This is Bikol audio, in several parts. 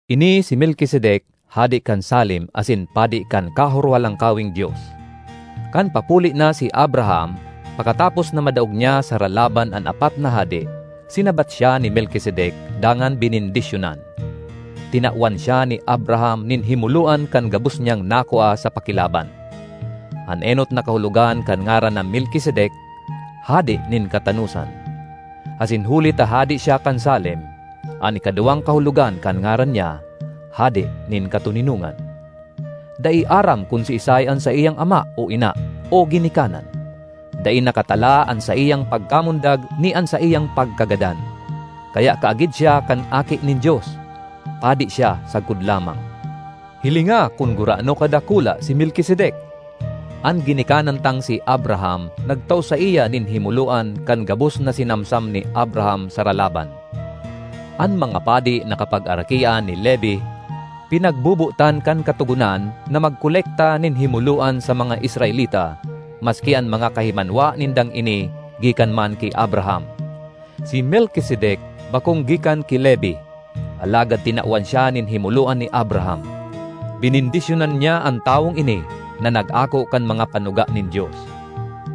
Ini si Melkisedek hade kan Salem asin padi kan Kahorohalangkaweng Dios. Kan papuli na si Abraham pakatapos na madaog niya sa ralaban an apat na hade, sinabat siya ni Melkisedek dangan benendisyonan. Tinawan siya ni Abraham nin himoloan kan gabos niyang nakua sa pakilaban. (An enot na kahulogan kan ngaran na Melkisedek, “Hade nin Katanosan”; asin huli ta hade siya kan Salem, an ikaduwang kahulogan kan ngaran niya, “Hade nin Katoninongan.”) Dai aram kun siisay an saiyang ama o ina o ginikanan. Dai nakatala an saiyang pagkamundag ni an saiyang pagkagadan. Kaya kaagid siya kan Aki nin Dios; padi siya sagkod lamang. Hilinga kun gurano kadakula si Melkisedek! An ginikanan tang si Abraham nagtao saiya nin himoloan kan gabos na sinamsam ni Abraham sa ralaban. An mga padi na kapagarakian ni Levi, pinagbobotan kan Katogonan na magkolekta nin himoloan sa mga Israelita, maski an mga kahimanwa nindang ini gikan man ki Abraham. Si Melkisedek bakong gikan ki Levi, alagad tinawan siya nin himoloan ni Abraham. Benendisyonan niya an tawong ini na nag-ako kan mga panuga nin Dios.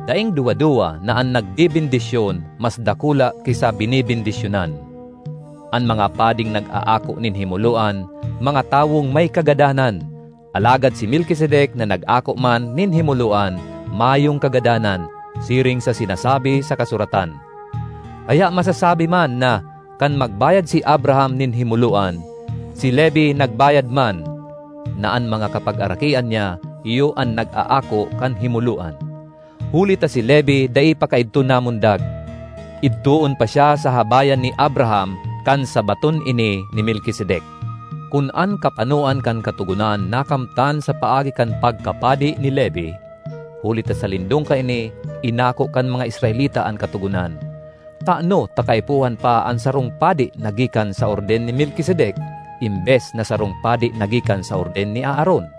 Daing duwa-duwa na an nagbebendisyon mas dakula ki sa benebendisyonan. An mga pading nag-aako nin himoloan, mga tawong may kagadanan, alagad si Melkisedek na nag-ako man nin himoloan, mayong kagadanan, siring sa sinasabi sa kasuratan. Kaya masasabi man na, kan magbayad si Abraham nin himoloan, si Levi nagbayad man (na an mga kapagarakian niya iyo an nag-aako kan himoloan). Huli ta si Levi dai pa kaidto namundag; idtoon pa siya sa habayan ni Abraham kan sabaton ini ni Melkisedek. Kun an kapanoan kan Katogonan nakamtan sa paagi kan pagkapadi ni Levi (huli ta sa lindong kaini, inako kan mga Israelita an Katogonan), tano ta kaipuhan pa an sarong padi na gikan sa orden ni Melkisedek embes na sarong padi na gikan sa orden ni Aaron?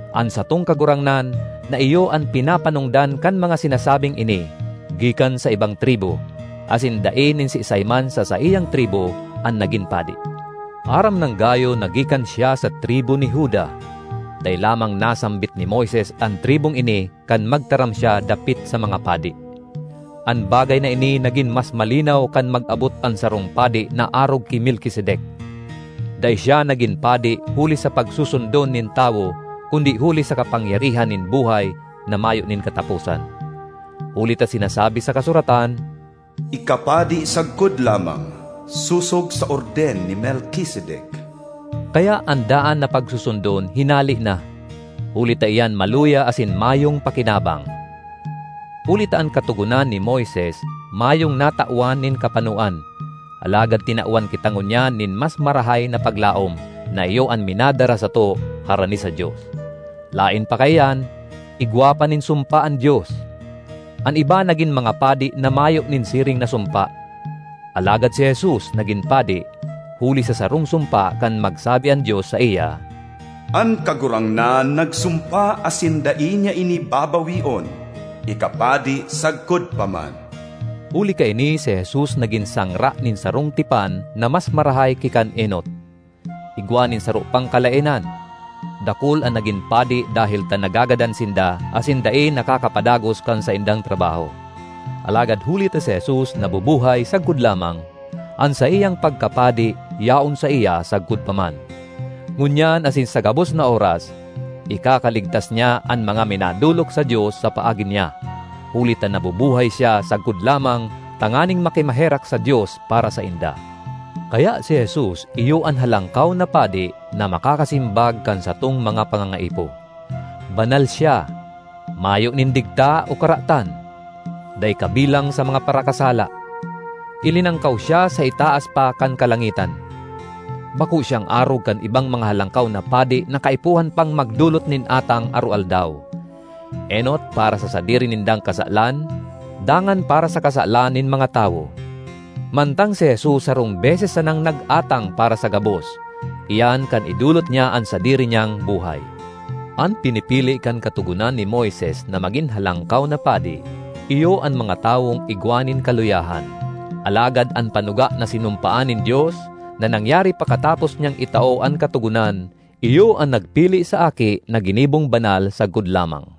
An satong Kagurangnan, na iyo an pinapanongdan kan mga sinasabing ini, gikan sa ibang tribu, asin dai nin siisay man sa saiyang tribu an nagin padi. Aram nang gayo na gikan siya sa tribu ni Juda; dai lamang nasambit ni Moises an tribung ini kan magtaram siya dapit sa mga padi. An bagay na ini nagin mas malinaw kan mag-abot an sarong padi na arog ki Melkisedek. Dai siya nagin padi huli sa pagsusundon nin tawo kundi huli sa kapangyarihan nin buhay na mayo nin kataposan. Huli ta sinasabi sa kasuratan, “Ika padi sagkod lamang, sosog sa orden ni Melkisedek.” Kaya an daan na pagsusundon hinale na, huli ta iyan maluya asin mayong pakinabang; huli ta an Katogonan ni Moises mayong natawan nin kapanoan, alagad tinawan kita ngunyan nin mas marahay na paglaom, na iyo an minadara sato harani sa Dios. Laen pa kaiyan, igwa pa nin sumpa an Dios. An iba nagin mga padi na mayo nin siring na sumpa. Alagad si Jesus nagin padi huli sa sarong sumpa kan magsabi an Dios saiya, “An Kagurangnan nagsumpa asin dai niya ini babaweon: ‘Ika padi sagkod pa man.’” Huli kaini si Jesus nagin sangra nin sarong tipan na mas marahay ki kan enot. Igwa nin saro pang kalaenan: dakul an nagin padi dahel ta nagagadan sinda asin dai nakakapadagos kan saindang trabaho. Alagad huli ta si Jesus nabubuhay sagkod lamang, an saiyang pagkapadi yaon saiya sagkod pa man. Ngunyan asin sa gabos na oras, ikakaligtas niya an mga minadolok sa Dios sa paagi niya, huli ta nabubuhay siya sagkod lamang tanganing makimaherak sa Dios para sainda. Kaya si Jesus iyo an Halangkaw na Padi na makakasimbag kan satong mga pangangaipo. Banal siya, mayo nin digta o karatan; dai kabilang sa mga parakasala, ilinangkaw siya sa itaas pa kan kalangitan. Bako siyang arog kan ibang mga halangkaw na padi na kaipuhan pang magdolot nin atang aroaldaw: enot para sa sadiri nindang kasalan, dangan para sa kasalan nin mga tawo; mantang si Jesus sarong beses sanang nag-atang para sa gabos—iyan kan idolot niya an sadiri niyang buhay. An pinipili kan Katogonan ni Moises na magin halangkaw na padi iyo an mga tawong igwa nin kaluyahan, alagad an panuga na sinumpaan nin Dios, na nangyari pakatapos niyang itao an Katogonan, iyo an nagpili sa Aki na ginibong banal sagkod lamang.